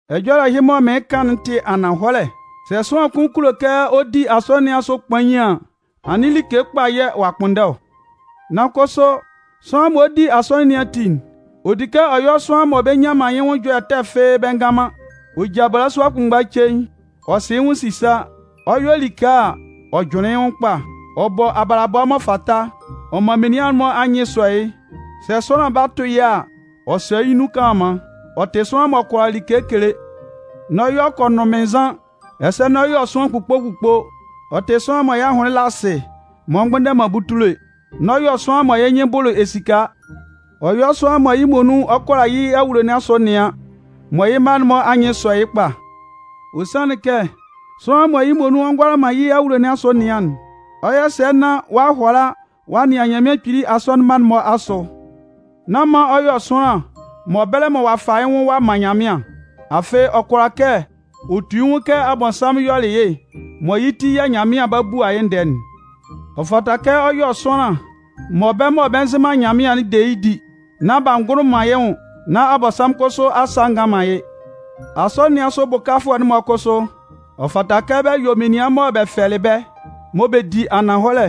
Ɛjɔlɛ ɛhɩ mɔ mɩɩn kan'n tɩ ananhɔlɛ: sɛ sʋanlan kʋn kulo kɛ ɔ di asɔnɩn nɩn asʋ kpain an, anɩn like kpa yɛ̂ ɔ'a kpʋnndɛ ɔ. Nan kʋsʋ sʋanlan mɔ ɔ 'di asɔnɩn nɩn ati'n, ɔ di kɛ ɔ yɔ́ sʋanlan mɔ bɛ nnyan man yɩ́ nwʋn ɛjɔlɛ ɛtɛ fɩ́ɩ́ bɛ ngan man. Ɔ ja balasua kʋnmgba cein. Ɔ sɩ yɩ́ nwʋn sisa. Ɔ 'yɔ like a, ɔ jʋnlɩn yɩ́ nwʋn kpa. Ɔ bɔ abalabɔ m'ɔ fata, ɔ man menian'n-mɔ anyɩn sɔ yɩ́. Sɛ sʋanlan ba tʋ yɩ́ a, ɔ sɔ yɩ́ nun kanlanman. Ɔ tɩ sʋanlan m'ɔ kʋala like kele. N'ɔ yɔ kɔnʋnmɩnnzan, ɛsɛ n'ɔ yɔ sʋanlan kpukpo-kpukpo. Ɔ tɩ sʋanlan mɔ yɩ́ ahʋnlɩn la asɩ m'ɔ mgbʋndɛ man butule. N'ɔ yɔ sʋanlan mɔ yɩ́ nyɩn bʋlʋ esika. Ɔ yɔ́ sʋanlan mɔ yɩ́ muonun ɔ kʋala yɩ́ awulo nɩn asʋ nɩan, mɔ yɩ́ mma'n-mɔ anyɩn sɔ yɩ́ kpa. Ɔ sanlɩn kɛ sʋanlan mɔ yɩ́ muonun ɔ ngʋala man yɩ́ awulo nɩn asʋ nɩan'n, ɔ 'yɔ sɛ nán ɔ'a hʋala ɔ'a nɩan Nyanmɩan Kpili asɔnɩn mma'n-mɔ asʋ? Nán man ɔ yɔ sʋanlan mɔ bɛlɛ mɔ ɔ'a fa yɩ́ nwʋn ɔ'a man Nyanmɩan. Afɩ ɔ kʋala kɛ ɔ tu yɩ́ nwʋn kɛ Abɔnsanmʋn yɔlɩ yɩ́ mɔ yɩ́ ti yɛ̂ Nyanmɩan 'ba bua yɩ́ ndɛɛ'n. Ɔ fata kɛ ɔ yɔ sʋanlan mɔ bɛ́ mɔ bɛ nzɩ Nyanmɩan'n de yɩ́ di, nán b'a ngʋlʋ man yɩ́ nwʋn, nán Abɔnsanmʋn kʋsʋ asa a ngan man yɩ́. Asɔnɩn nɩn asʋ bʋkafʋɛ'n-mɔ kʋsʋ, ɔ fata kɛ bɛ yɔ́ menian mɔ bɛ fɛlɩ bɛ́, mɔ bɛ di ananhɔlɛ.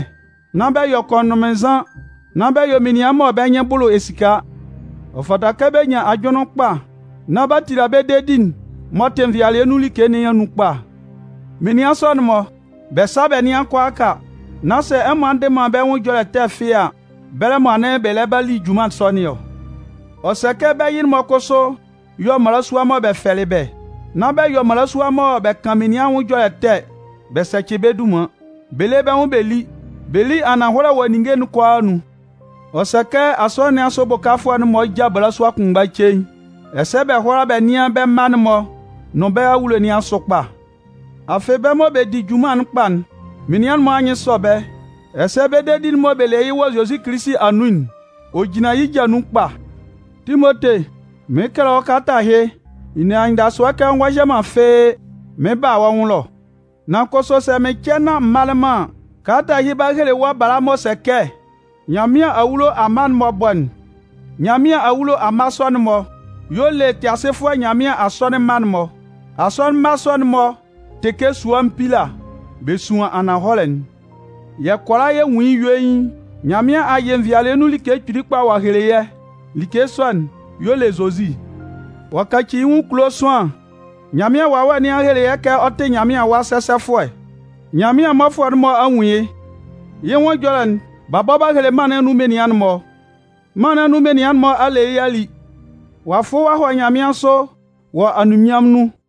Nán bɛ yɔ kɔnʋnmɩnnzan, nán bɛ yɔ menian mɔ bɛ́ nyɩn bʋlʋ esika. Ɔ fata kɛ bɛ nyan ajʋnlɩn kpa nán b'a tila bɛ́ dedi'n m'ɔ tɩ nvɩalɩɛ nun like nɩn anun kpa. Menian sɔ'n-mɔ, bɛ sá bɛ́ nɩ́an kʋalaaka, nán sɛ ɛmɔ a ndɩ man bɛ́ nwʋn ɛjɔlɛ ɛtɛ fɩ́ɩ́ a, bɛlɛ mɔ anɩn bɛ lɛ ba li junman sɔ nɩn ɔ. Ɔ sɛ kɛ bɛ́ yɩ-mɔ kʋsʋ yɔ́ mmalasua mɔ bɛ fɛlɩ bɛ́. Nán bɛ yɔ mmalasua mɔ bɛ kan menian anwʋn ɛjɔlɛ ɛtɛ bɛ sɛcɩ bɛ́ dunman. Bɛ lé bɛ́ nwʋn bɛ lí. Bɛ lí ananhɔlɛ wɔ ninnge kʋalaa anun. Ɔ sɛ kɛ asɔnɩn nɩn asʋ bʋkafʋɛ'n-mɔ já balasua kʋnmgba cein, ɛsɛ bɛ hʋ́ala bɛ nɩ́an bɛ́ mma'n-mɔ nʋn bɛ́ awulo nɩn asʋ kpa. Afɩ bɛ́ mɔ bɛ di bɛ́ junman'n kpa'n, menian'n-mɔ anyɩn sɔ bɛ́, ɛsɛ bɛ́ dedi'n mɔ bɛ le yɩ́ wɔ Zozi Kilisi anun'n, ɔ jinlan yɩ́ ja nun kpa. Timote, mɩɩn kɛlɛ wɔ́ kalata ɛhɩ, n ne anyɩndasʋɛ kɛ ɔ ngɔ hyɛ man fɩ́ɩ́ mɩn 'ba a wɔ́ nwʋn ɛlɔ. Nan kʋsʋ sɛ mɩn cɛ nán m malɩ man an, kalata ɛhɩ 'ba hele wɔ́ bala m'ɔ sɛ kɛ Nyanmɩan awulo amma'n-mɔ bɔ'n. Nyanmɩan awulo amma sɔ'n-mɔ y'ɔ le Tɩasɩfʋɛ Nyanmɩan asɔnɩn mma'n-mɔ. Asɔnɩn mma sɔ'n-mɔ tɩ kɛ sua mpila, bɛ suan ananhɔlɛ'n. Yɛ́ kʋalaa yɛ nwun yɩ́ yuein, Nyanmɩan a yɩ nvɩalɩɛ nun like kpili kpa ɔ'a hele yɛ́. Like sɔ'n y'ɔ le Zozi. Ɔ'a kaci yɩ́ nwʋn kulo sʋanlan. Nyanmɩan Wawɛ nɩn a hele kɛ ɔ tɩ Nyanmɩan Awa sɛsɛfʋɛ. Nyanmɩan mmɔfʋɛ'n-mɔ a nwun yɩ́. Yɩ́ nwʋn ɛjɔlɛ'n, b'a bɔ b'a hele mân nɩn anun menian'n-mɔ. Mân nɩn anun menian'n-mɔ a le yɩ́ a li. Ɔ'a fʋ ɔ'a hɔ nyanmɩansʋ wɔ anunminnyanmʋn nun.